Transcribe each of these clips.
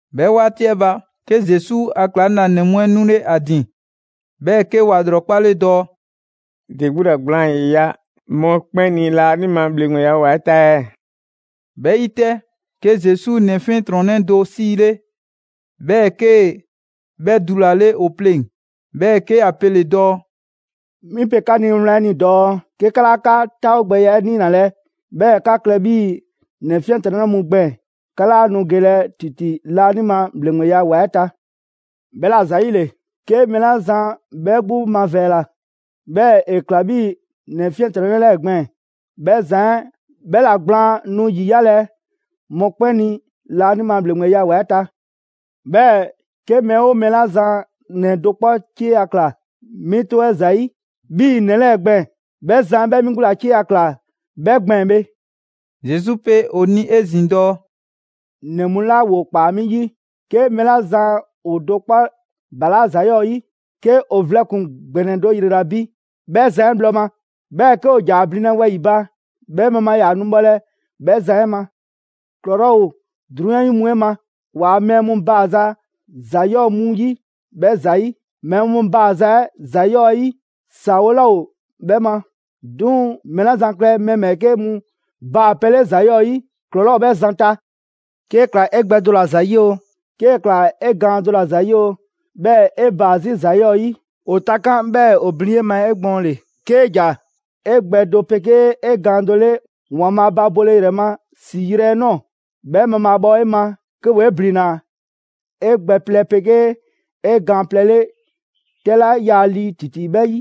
'Bhɛ 'waati 'ɛ ba, 'ke Zesu a ‑klaŋlanɛ mu 'ɛ 'nule ‑a ‑din, 'bhɛɛ‑ 'ke ‑wa ‑lrɔkpale dɔɔ: «‑De 'gbu ‑la gblaan 'yiya‑ mɔkpɛn' ni laanima ‑bhleŋgbeya ‑wa 'ɛ ta ɛɛ?» 'Bhɛ 'yi 'tɛ, 'ke Zesu ‑nɛ 'fiɛntrɔnnɛ do 'siile, 'bhɛɛ‑ 'kee‑ 'bhɛ dulale ‑o pleŋ‑, 'bhɛɛ‑ 'ke ‑ya pele dɔɔ: «'Mi pe 'ka ni wlan 'ɛ ni dɔɔ 'ke 'ka 'laa 'ka 'taawogbɛya 'ɛ niinalɛ, 'bhɛɛ‑ 'ka klɛ 'bhii‑ ‑nɛ 'fiɛntrɔnnɛ mu gbɛɛn‑, 'ka 'laa nu gelɛ ‑titi laanima ‑bhleŋgbeya ‑wa 'ɛ ta. 'Bhɛla‑ ‑zayile, 'ke mɛɛ 'la zan 'bhɛ 'gbu mavɛɛla, 'bhɛɛ‑ ‑e ‑kla 'bhii‑ ‑nɛ 'fiɛntrɔnnɛ 'lɛɛ‑ gbɛɛn‑, 'bhɛ zan 'ɛ 'bhɛ ‑la gblaan nu ‑yiyalɛ mɔkpɛn' ni laanima ‑bhleŋgbeya ‑wa 'ɛ ta. 'Bhɛɛ‑ 'ke mɛɛ 'oo mɛɛ 'la zan ‑nɛ do 'kpɔ 'cieya‑ ꞊kla 'mi 'tɔ 'ɛ ‑zayi' 'bhii‑ ‑nɛ 'lɛɛ‑ gbɛɛn‑, 'bhɛ zan 'ɛ 'bhɛ 'mi 'gbu ‑la 'cieya‑ ꞊kla 'bhɛ gbɛɛn‑ bhe.» Zesu pe ‑o ni 'ezin‑ dɔɔ: «‑Nɛ mu 'la ‑woo ꞊kpaa 'mi 'yi, 'ke mɛɛ 'la zan ‑o do 'kpɔ ‑balaa' ‑za 'yɔɔ‑ 'yi, 'ke ‑o vlɛ ‑kpuŋ ‑gbɛnɛ do ‑yrela bi 'bhɛ zan 'ɛ bhlɔ ma, 'bhɛɛ‑ 'ke ‑o ‑ja ‑a blinlɛ wɛyi‑ ba, 'bhɛ mabhaa ‑yaa nu bhɔlɛ 'bhɛ zan 'ɛ ma. ‑Klɔlɔɔ' ‑o 'drunyan 'yi mu 'ɛ ma ‑waa' mɛɛ mu baaza ‑za ‑yɔɔ' mu 'yi 'bhɛ ‑zayi'. Mɛɛ mu baaza 'ɛ ‑za ‑yɔɔ' 'ɛ 'yi, ‑saawole laa ‑o 'bhɛ ma. 'Duŋ‑ mɛɛ 'la zan klɛ mɛɛ ‑bhɛɛke' mu baapɛ 'le ‑za 'yɔɔ‑ 'yi, ‑klɔlɔɔ' ‑o 'bhɛ zan ta.» «'Kee‑ ꞊kla 'e gbɛ do ‑la ‑zayi' oo, 'kee‑ ꞊kla 'e gaan do ‑la ‑zayi' oo, 'bhɛɛ‑ 'e baa‑ 'zi ‑za 'yɔɔ‑ 'yi, ‑o takan', 'bhɛɛ‑ ‑o blin 'e ma 'egbɔɔnle. 'Kee ‑ja 'e gbɛ do 'pegee 'e gaan do 'le ‑Waanbhaa' ba bole ‑yrɛ ma ‑si yrɛ 'ɛ ꞊nɔɔ, 'bhɛ mabhaabhɔ 'e ma, 'ke ‑woo 'e ‑blinna 'e gbɛ plɛ 'pegee 'e gaan plɛ 'le 'tɛ 'la yaa lii ‑titi 'bhɛ 'yi.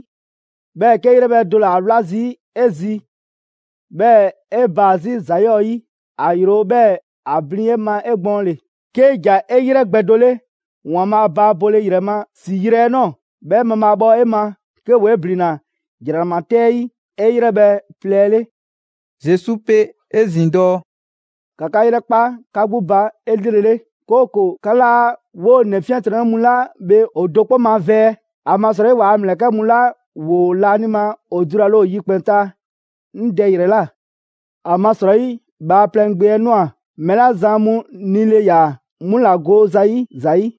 'Bhɛɛ‑ 'kee‑ 'yrɛbhɛ‑ do ‑le 'a 'wla zii' 'e zi 'bhɛɛ‑ 'e baa‑ 'zi ‑za 'yɔɔ‑ 'yi, ‑a ‑yro 'bhɛɛ‑ ‑a blin 'e ma 'egbɔɔnle. 'Kee ‑ja 'e 'yrɛ gbɛ do 'le ‑Waanbhaa' ba bole ‑yrɛ ma ‑si yrɛ 'ɛ ꞊nɔɔ 'bhɛ mabhaabhɔ 'e ma, 'ke ‑woo 'e ‑blinna ‑jranama 'tɛ 'ɛ 'yi 'e 'yrɛbhɛ‑ plɛ 'ɛ 'le.» Zesu pe 'ezin‑ dɔɔ: «‑Ka 'ka 'yrɛkpa 'ka 'gbu ba 'elrele, 'kooko‑ 'ka 'laa 'woo‑ ‑nɛ 'fiɛntrɔnnɛ mu 'la bhe ‑o do 'kpɔ mavɛɛ; ‑amasrɔyi ‑waa' ‑mlɛkɛ' mu 'la ‑woo laanima ‑o dulale ‑o yikpɛn‑ ta 'ŋ Dɛ ‑yrɛ ꞊la. ‑Amasrɔyi Bhaaplɛŋ Gbe 'ɛ ꞊nwa mɛɛ 'la zan mu nile ‑yaa, 'mu 'la go zayi' ‑za 'yi.»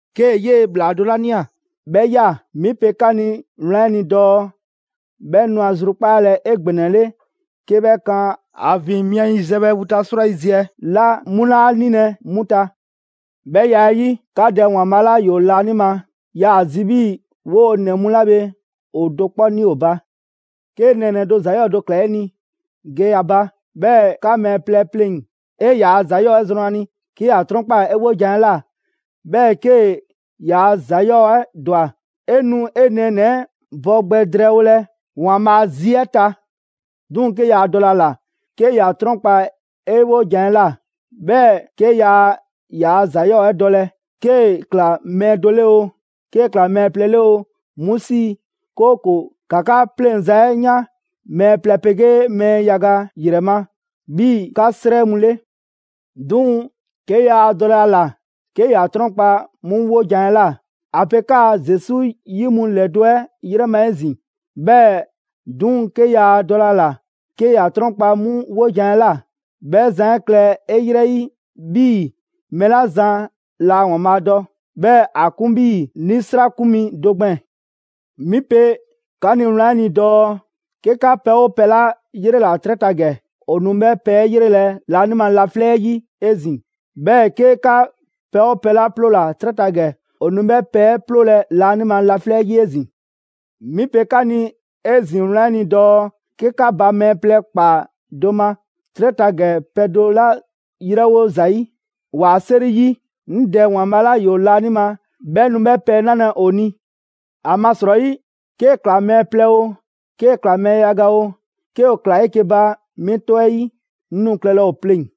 'Kee‑ 'yee‑ ‑bhlaa do 'la ꞊nia 'bhɛ ꞊ya, 'mi pe 'ka ni wlan 'ɛ ni dɔɔ 'bhɛ nu ‑a zrukpaalɛ 'egbɛnɛle 'ke 'bhɛ kan ‑a ‑vin mia yiziɛ bhɛ vu ta 'srwayiziɛ 'la 'mu 'laa 'nilɛ‑ 'mu ta. 'Bhɛ ya 'ɛ 'yi, 'ka Dɛ ‑Waanbhaa' 'la ‑yoo laanima yaa‑ zi 'bhii‑ 'woo‑ ‑nɛ mu 'la bhe ‑o do 'kpɔ ni ‑o ba.» «'Kee nɛɛnɛ‑ do ‑za 'yɔɔ‑ do ꞊kla 'e ni, ge ‑a ba, 'bhɛɛ‑ 'ka mɛɛ plɛ 'pleŋ‑, 'e ‑yaa' ‑za 'yɔɔ‑ 'ɛ zrɔn ‑a ni. 'Ke ‑ya 'trɔnkpaa‑ 'e 'wojan‑ 'ɛ ꞊la, 'bhɛɛ‑ 'kee‑ ‑yaa' ‑za 'yɔɔ‑ 'ɛ ‑dwa, 'e nu 'e nɛɛnɛ‑ 'ɛ bɔ gbɛ drɛɛwolɛ ‑Waanbhaa' a zi 'ɛ ta. 'Duŋ‑ 'ke yaa dɔlɛ a ‑la 'ke ‑ya 'trɔnkpa‑ 'e 'wojan‑ 'ɛ ꞊la, 'bhɛɛ‑ 'ke yaa ‑yaa ‑za 'yɔɔ‑ 'ɛ dɔlɛ, 'kee‑ ꞊kla mɛɛ do 'le oo, 'kee‑ ꞊kla mɛɛ plɛ 'le oo, 'mu 'sii‑, 'kooko‑ 'ka 'ka 'pleŋza‑ 'ɛ yan mɛɛ plɛ 'pegee mɛɛ yaga ‑yrɛ ma 'bhii‑ 'ka 'srɛ mu 'le. 'Duŋ‑ 'ke yaa dɔlɛ a ‑la 'ke ‑ya 'trɔnkpa‑ 'mu 'wojan‑ 'ɛ ꞊la, ‑a pe 'kaa‑ Zesu 'yi mu ‑lɛdo' 'ɛ 'yrɛ ma 'ezin‑; 'bhɛɛ‑ 'duŋ‑ 'ke yaa dɔlɛ ‑a ‑la 'ke ‑ya 'trɔnkpa‑ 'mu 'wojan‑ 'ɛ ꞊la, 'bhɛ zan 'ɛ klɛ 'e 'yrɛ 'yi 'bhii‑ mɛɛ 'la zan laa ‑Waanbhaa' dɔ, 'bhɛɛ‑ ‑a 'kun 'bhii‑ 'nisrakun mi do gbɛɛn‑. «'Mi pe 'ka ni wlan 'ɛ ni dɔɔ: 'Ke 'ka pɛ 'oo pɛ 'la 'yrela‑ 'trɛ ta ‑gɛ, ‑o nu 'bhɛ pɛ 'ɛ 'yrelɛ‑ laanima laflɛ' 'yi 'ezin‑. 'Bhɛɛ‑ 'ke 'ka pɛ 'oo pɛ 'la 'ploola‑ 'trɛ ta ‑gɛ, ‑o nu 'bhɛ pɛ 'ɛ 'ploolɛ‑ laanima laflɛ' 'yi 'ezin‑.» «'Mi pe 'ka ni 'ezin‑ wlan 'ɛ ni dɔɔ 'ke 'ka ba mɛɛ plɛ ꞊kpaa do ma 'trɛ ta ‑gɛ pɛ do 'la ‑yrɛwo' zayi' ‑waa' 'seri 'yi, 'ŋ Dɛ ‑Waanbhaa' 'la ‑yoo laanima 'bhɛ nu 'bhɛ pɛ 'ɛ 'nalɛ‑ ‑o ni. ‑Amasrɔyi, 'kee‑ ꞊kla mɛɛ plɛ oo, 'kee‑ ꞊kla mɛɛ yaga oo, 'ke ‑o ꞊klaa 'eke‑ ba 'mi 'tɔ 'ɛ 'yi 'ŋ nu klɛlɛ ‑o pleŋ‑.»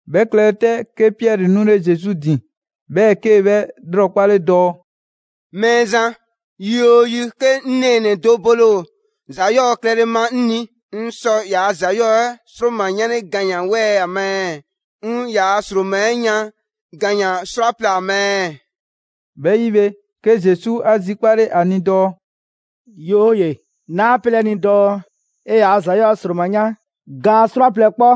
'Bhɛ klɛle 'tɛ, 'ke Piɛri 'nule Zesu ‑din, 'bhɛɛ‑ 'kee‑ 'bhɛ ꞊lrɔkpale dɔɔ: «Mɛɛzan, yi 'oo yi 'ke 'ŋ nɛɛnɛ‑ do bole ‑o ‑za 'yɔɔ‑ klɛle ma 'ŋ ni, 'ŋ sɔ ‑yaa' ‑za 'yɔɔ‑ 'ɛ ‑sroma 'yanle gaan ‑wɛɛ' ‑a ma ɛɛ? 'Ŋ ‑yaa' ‑sroma 'yan gaan 'srwaplɛ‑ ‑a ma ɛɛ?» 'Bhɛ 'yi bhe, 'ke Zesu 'a zikpale ‑a ni dɔɔ: «'Yooye‑, 'naa 'pelɛ‑ 'e ni dɔɔ 'e ‑yaa' ‑za 'yɔɔ‑ 'ɛ ‑sroma 'yan gaan 'srwaplɛ‑ 'kpɔ,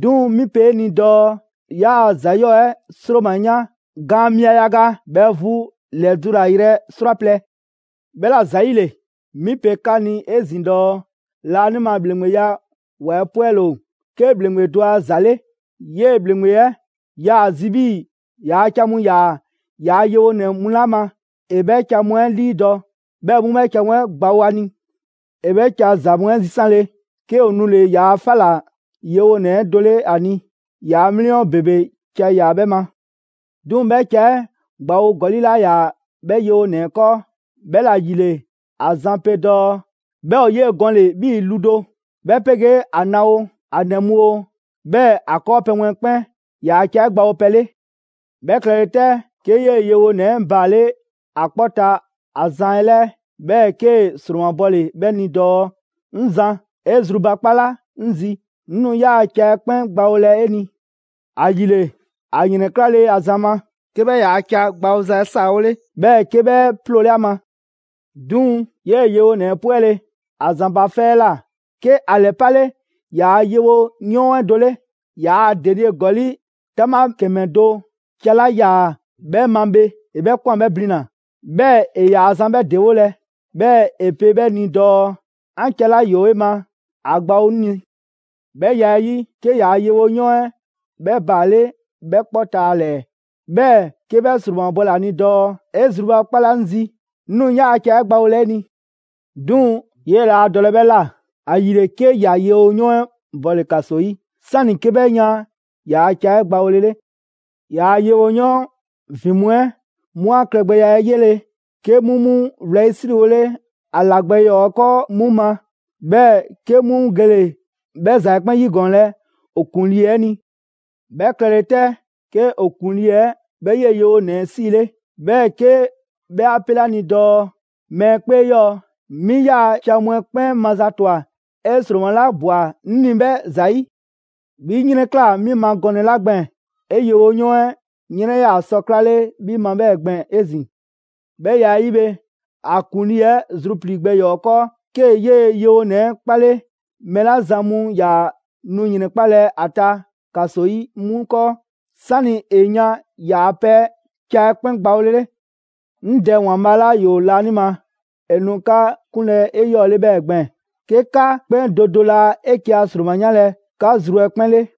'duŋ‑ 'mi pe 'e ni dɔɔ ‑yaa' ‑za 'yɔɔ‑ 'ɛ ‑sroma 'yan gaan mia yaga 'bhɛ vu ‑lɛdulayrɛ 'srwaplɛ‑. 'Bhɛla‑ ‑zayile, 'mi pe 'ka ni 'ezin‑ dɔɔ laanima ‑bhleŋgbeya ‑wa 'ɛ 'pwɛle‑ ‑o 'ke ‑bhleŋgbe do a ‑za ‑le: 'Yee‑ ‑bhleŋgbe 'ɛ 'yaa‑ ‑a zi 'bhii‑ ‑yaa' ca mu ‑yaa ‑yaa' yewonɛ mu 'la ma, ‑e 'bhɛ ca mu 'ɛ 'liidɔ‑, 'bhɛɛ‑ 'mu 'bhɛ ca mu 'ɛ gbawo ‑a ni. ‑E 'bhɛ ca za mu 'ɛ zisanle, 'ke ‑o nule‑ ‑yaa' 'fa ꞊la yewonɛ 'ɛ do 'le ‑a ni. ‑Yaa' 'mliyɔn ‑bebe ca ‑yaa 'bhɛ ma. 'Duŋ‑ 'bhɛ ca 'ɛ gbawo ‑gɔli' 'laa ‑yaa 'bhɛ yewonɛ 'ɛ 'kɔɔ. 'Bhɛla‑ ‑yile, a zan pe dɔɔ 'bhɛ ‑o 'yee‑ gɔnle‑ 'bhii lu do, 'bhɛ 'pegee ‑a na oo, ‑a ‑nɛ mu oo, 'bhɛɛ‑ ‑a 'kɔɔpɛ‑ mu 'ɛ 'kpɛn, ‑yaa' ca 'ɛ gbawopɛ 'le. 'Bhɛ klɛle 'tɛ, 'ke 'yee‑ yewonɛ 'ɛ baale' ‑a 'kpɔ ta ‑a zan 'ɛ 'lɛɛ, 'bhɛɛ‑ 'kee‑ ‑sromabɔle 'bhɛ ni dɔɔ: ‹'Ŋ Zan, 'e zrubakpala 'ŋ zi, 'ŋ nu 'yaa‑ ca 'ɛ 'kpɛn gbawolɛ 'e ni!› ‑Ayile, ‑a ‑yrɛnklale ‑a zan ma, 'ke 'bhɛ ‑yaa' ca gbawoza 'ɛ 'saawole, 'bhɛɛ‑ 'ke 'bhɛ 'ploole ‑a ma.» «'Duŋ‑, 'yee‑ yewonɛ 'ɛ 'e 'pwɛle‑ ‑a zan ba 'fɛ 'ɛ ꞊la, 'ke ‑a ‑lɛpale ‑yaa' yewoyɔɔn 'ɛ do 'le. Yaa denie ‑gɔli' 'taŋbha ‑kɛmɛ do ca 'la 'yaa‑ 'bhɛ ma bhe, ‑e 'bhɛ ꞊kwan 'bhɛ blina‑, 'bhɛɛ‑ ‑e ‑yaa zan 'bhɛ ‑dewolɛ, 'bhɛɛ‑ ‑e pe 'bhɛ ni dɔɔ: ‹'An ca 'la ‑yoo 'e ma ‑a gbawo 'ŋ ni!› 'Bhɛ ya 'ɛ 'yi, 'ke ‑yaa' yewoyɔɔn 'ɛ 'bhɛ baale' 'bhɛ 'kpɔ ta ‑a ‑lɛɛ, 'bhɛɛ‑ 'ke 'bhɛ ‑sromabɔle ‑a ni dɔɔ: ‹'E zrubakpala 'ŋ zi, 'ŋ nu 'yaa‑ 'ɛ gbawolɛ 'e ni!› 'Duŋ‑, 'yee‑ laa dɔlɛ 'bhɛ ꞊la; ‑ayile 'ke ‑ya yewoyɔɔn 'ɛ bɔle‑ ‑kaso 'yi 'sani‑ 'ke 'bhɛ yan ‑yaa' ca 'ɛ gbawolele. ‑Yaa' yewoyɔɔn ‑vin mu 'ɛ 'mu 'a klɛgbɛya 'ɛ 'yele‑, 'ke 'mu 'mu 'wlɛyisriwole ‑a ‑la gbɛ ‑yɔɔ 'ɛ 'kɔɔ 'mu ma. 'Bhɛɛ‑ 'ke 'mu gele‑ 'bhɛ ‑za 'ɛ 'kpɛn 'yigɔɔnlɛ ‑o ‑kuŋlii 'ɛ ni. 'Bhɛ klɛle 'tɛ, 'ke ‑o ‑kuŋlii 'ɛ 'bhɛ 'yee‑ yewonɛ 'ɛ 'siile, 'bhɛɛ‑ 'ke 'bhɛ 'a 'pele ‑a ni dɔɔ: ‹Mɛɛ 'kpee 'yɔɔ‑! 'Mi 'yaa‑ ca mu 'ɛ 'kpɛn mazatwa 'e ‑sroma 'la ꞊bwa 'ŋ ni 'bhɛ ‑zayi'. 'Bhi 'yrɛnklaa‑ 'mi ma gɔnɛ‑ 'la gbɛɛn‑, 'e yewoyɔɔn 'ɛ 'yrɛn 'yaa‑ sɔ 'klale 'bhi ma 'bhɛɛ‑ gbɛɛn‑ 'ezin‑.› 'Bhɛ ya 'ɛ 'yi bhe, ‑a ‑kuŋlii 'ɛ zruplii‑ gbɛ ‑yɔɔ' 'ɛ 'kɔɔ 'kee‑ 'yee‑ yewonɛ 'ɛ 'kpale mɛɛ 'la zan mu ‑yaa nu ‑yrɛnkpalɛ ‑a ta ‑kaso 'yi 'mu 'kɔɔ, 'sani‑ ‑e yan ‑yaa pɛ ca 'ɛ 'kpɛn gbawole 'le. «'Ŋ Dɛ ‑Waanbhaa' 'la ‑yoo laanima, ‑e nu 'ka 'kunlɛ‑ 'eyɔɔle 'bhɛɛ‑ gbɛɛn‑, 'ke 'ka 'kpɛn do do laa 'eke‑ a ‑sroma 'yanlɛ‑ 'ka zru 'ɛ 'kpɛn 'le.»